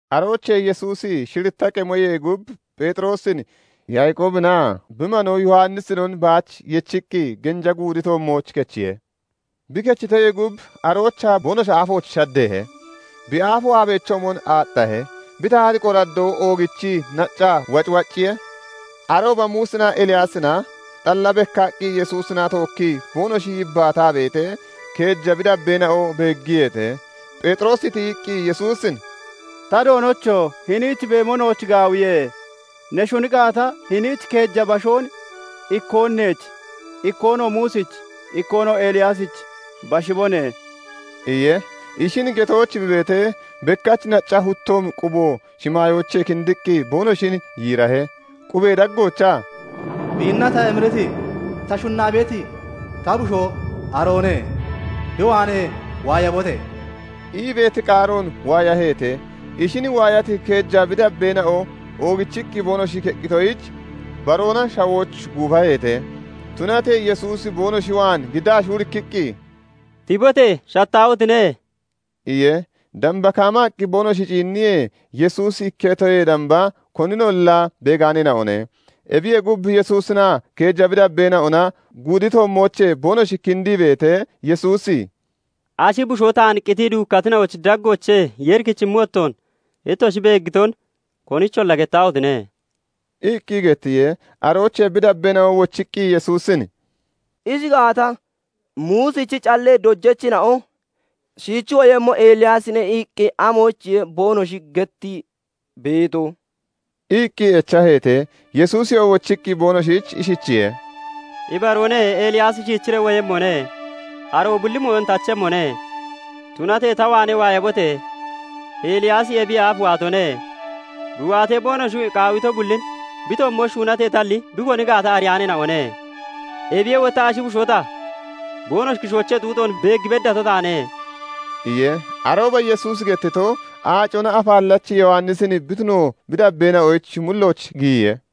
Aroochee Yesuusi shiritta qemoyee gub Pheexiroosin, Yaaqoobinaa bi manoo Yowannisinon baach yechiqqi genja guudi toommooch kechiye. Bi kechitoyee gub aroochaa boonoshi aafooch shaddeehe; bi aafo aabechoomon aaxxahe; bi tahati qoraddoo oogichii naccaa wacwacciye. Arooba Muusinaa Eliyaasina xalla bekkaqqi Yesuusina tookkii boonoshi yibbaataa beetee, keeja bi dabbeena'o beeggiyeete. Pheexiroosi tiyiqqi Yesuusin "Ta Doonocho! Hiniich beemo nooch gaawiye. Ne shuni gaata, hiniich keeja bashoon, ikkoon neech, ikkoonoo Muusich, ikkoonoo Eliyaasich bashibone" iye. Ishin getooch bi beetee, bekkach nacca huttoomi qubo shimaayoochee kindiqqi boonoshin yiirahe; qubee daggoochaa "Biinna ta emiriti ta shunnaa beeti ta bushoo aroone. bi waanee waayabote!" ii beeti qaaroon waayaheete. Ishin waayati keeja bi dabbeena'o oogichiqqi boonoshi keqqitoyich, baroona shawooch guufaheete. Tunatee Yesuusi boonoshi waan giddaa shuurikkiqqi, "Tibote! Shattaahotine!" iye. Damba kaamaqqi boonoshi ciinniyee, Yesuusi ikketoyee damba koninolla beegaaneena'one. Ebiyee gub, Yesuusinaa keeja bi dabbeena'ona guudi toommoochee boonoshi kindii beetee, Yesuusi "Ashi bushoo taan qitii duukkatina'ochi daggoochee Yeeri kichimmi wottoon, ittoshi beeggiton konicholla gettaahotine!" iqqi gettiye. Aroochee bi dabbeena'o wochiqqi Yesuusin "Ishi gaata, Muusichi callee dojachina'o 'Shiichi woyemmo Eliyaasine' iqqi amoyichiye boonoshi gettii beeto?" iqqi echaheete. Yesuusiyoo wochiqqi boonoshich ishichiye:- "Ibaroone; Eliyaasi shiichiree woyemmone. aroo bulli mooyon tachemmone. Tunatee ta waanee waayabote! Eliyaasi ebiyee aaf waatone. Bi waatee, boonoshi qaawito bullin bi toommooch shuunateetalli bi koni gaata ariyaaneena'one. Ebiyee wotta ashi bushoo ta boonoshi kishoochee xuuxoon beeg beddato taane" iye. Arooba Yesuusi gettito, Aacona Afaallachi Yowannisin bi tuno bi dabbeena'ochi mullooch giyiye.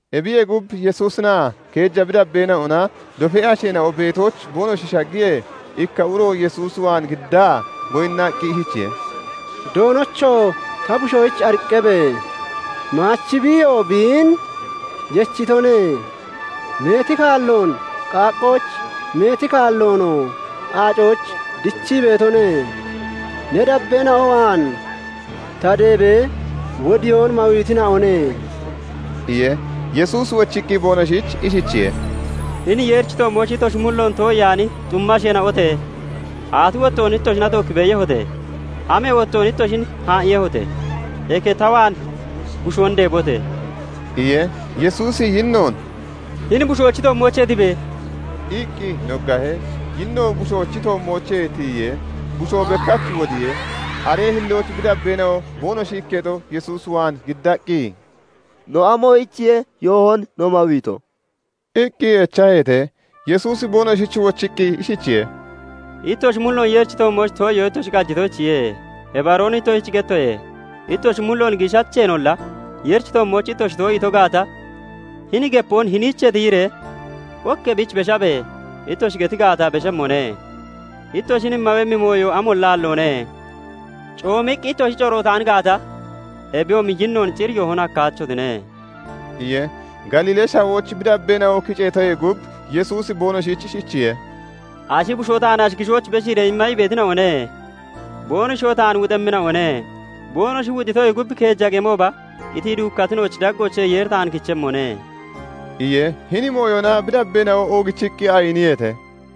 Ebiyee gub, Yesuusinaa keeja bi dabbeena'ona dofee asheena'o beetooch boonoshi shaggiyee, ikka uro Yesuus waan giddaa goyinnaqqi ishichiye:- "Doonocho! Ta bushoyich ariqqabe! Maachi biiyoo biin yechitone. Meeti kaalloon qaaqqooch, meeti kaalloonoo aacooch dichii beetone. Ne dabbeena'o waan ta deebee, wodiyoon mawiitina'one" iye. Yesuusi wochiqqi boonoshich ishichiye:- "Hini Yeerichi toommooch ittoshi mulloon too'iyaani xumma asheena'ote! Aati wottoon ittoshina tookki beeyehote? Amee wottoon ittoshin haa'iiyehote? Eke ta waan bushoon deebote!" iye. Yesuusi yinnoon "Hini bushoochi toommoochee tibe!" iqqi noggahe. Yinnoo bushoochi toommoochee tiyiye; bushoo bekkach wodiye. Aree hillooch bi dabbeena'o boonoshi ikketo Yesuus waan giddaqqi, "No amoyichiye yoohon no mawiito?" iqqi echaheete. Yesuusi boonoshich wochiqqi ishichiye:- "Ittoshi mulloon Yeerichi toommooch too'iyoo ittoshi qajitoyichiye. Ibaroon ittoshich gettoye; ittoshi mulloon giishacheenolla Yeerichi toommooch ittoshi too'iito gaata, hini gepoon 'Hiniichee tiyiree ok ebiich beshabe!' ittoshi geti gaata, beshemmone; ittoshin mawemmi mooyo amolla aalloone. [Coomiqqi ittoshi corootaan gaata, ebiyoomi yinnoon cir yoohon hakkaachotine]" iye. Galiilee Shawooch bi dabbeena'o kiceetoyee gub, Yesuusi boonoshich ishichiye:- "Ashi bushoo taan ashi kishooch beshiiree imma ii beetina'one; Boonoshiyoo taan wuxemmina'one; boonoshi wuxitoyee gub keeja qemooba qitii duukkatina'ochi daggoochee Yeeri taan kichemmone" iye. Hini mooyona bi dabbeena'o oogichiqqi ayiniyeete.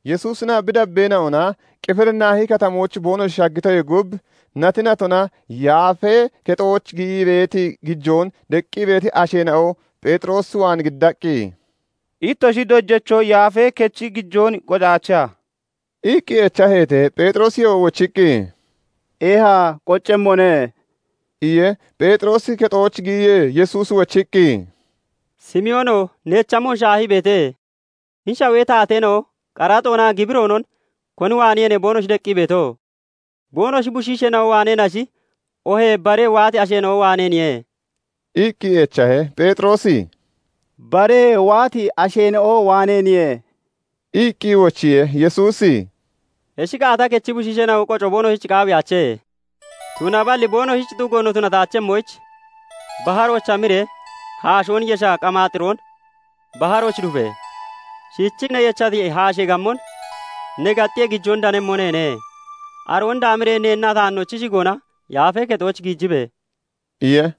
Yesuusinaa bi dabbeena'ona Qifirinaahi Katamooch boonoshi shaggitoyee gub, nati natona yaafee kexooch giyii beeti gijoon deqqi beeti asheena'o Pheexiroos waan giddaqqi, "Ittoshi dojacho Yaafee Kechi gijoon qocaacheha?" iqqi echaheete. Pheexirooyoo wochiqqi, "Eeha qoccemmone" iye. Pheexiroosi kexooch giyiyee, Yesuusi shiichiqqi, "Simoono! Neech amon shaahii beete? Hini Shawee taateena'o qaraxoonaa gibiroonon koni waaneeniye boonoshi deqqi beeto? Boonoshi bushiisheena'o waaneenashi oohee baree waati asheena'o waaneeniye?" iqqi echahe. Pheexiroosi "Bare waati asheena'o waaneeniye" iqqi wochiye. Yesuusi "Ishi gaata, kechi bushiisheena'o qoco boonoshich qaawiyaache. Tunaballi boonoshich xugo no tunataachemmoyich, baharooch hamiree haashoon yesha qamaaxiroon baharooch dufe! Shiichii ne yechati haashee gammon ne gaxxiyee, gijoon danemmo neene; aroon daamiree neennaa taannoch shigoona Yaafee Kexooch giijibe!" iye.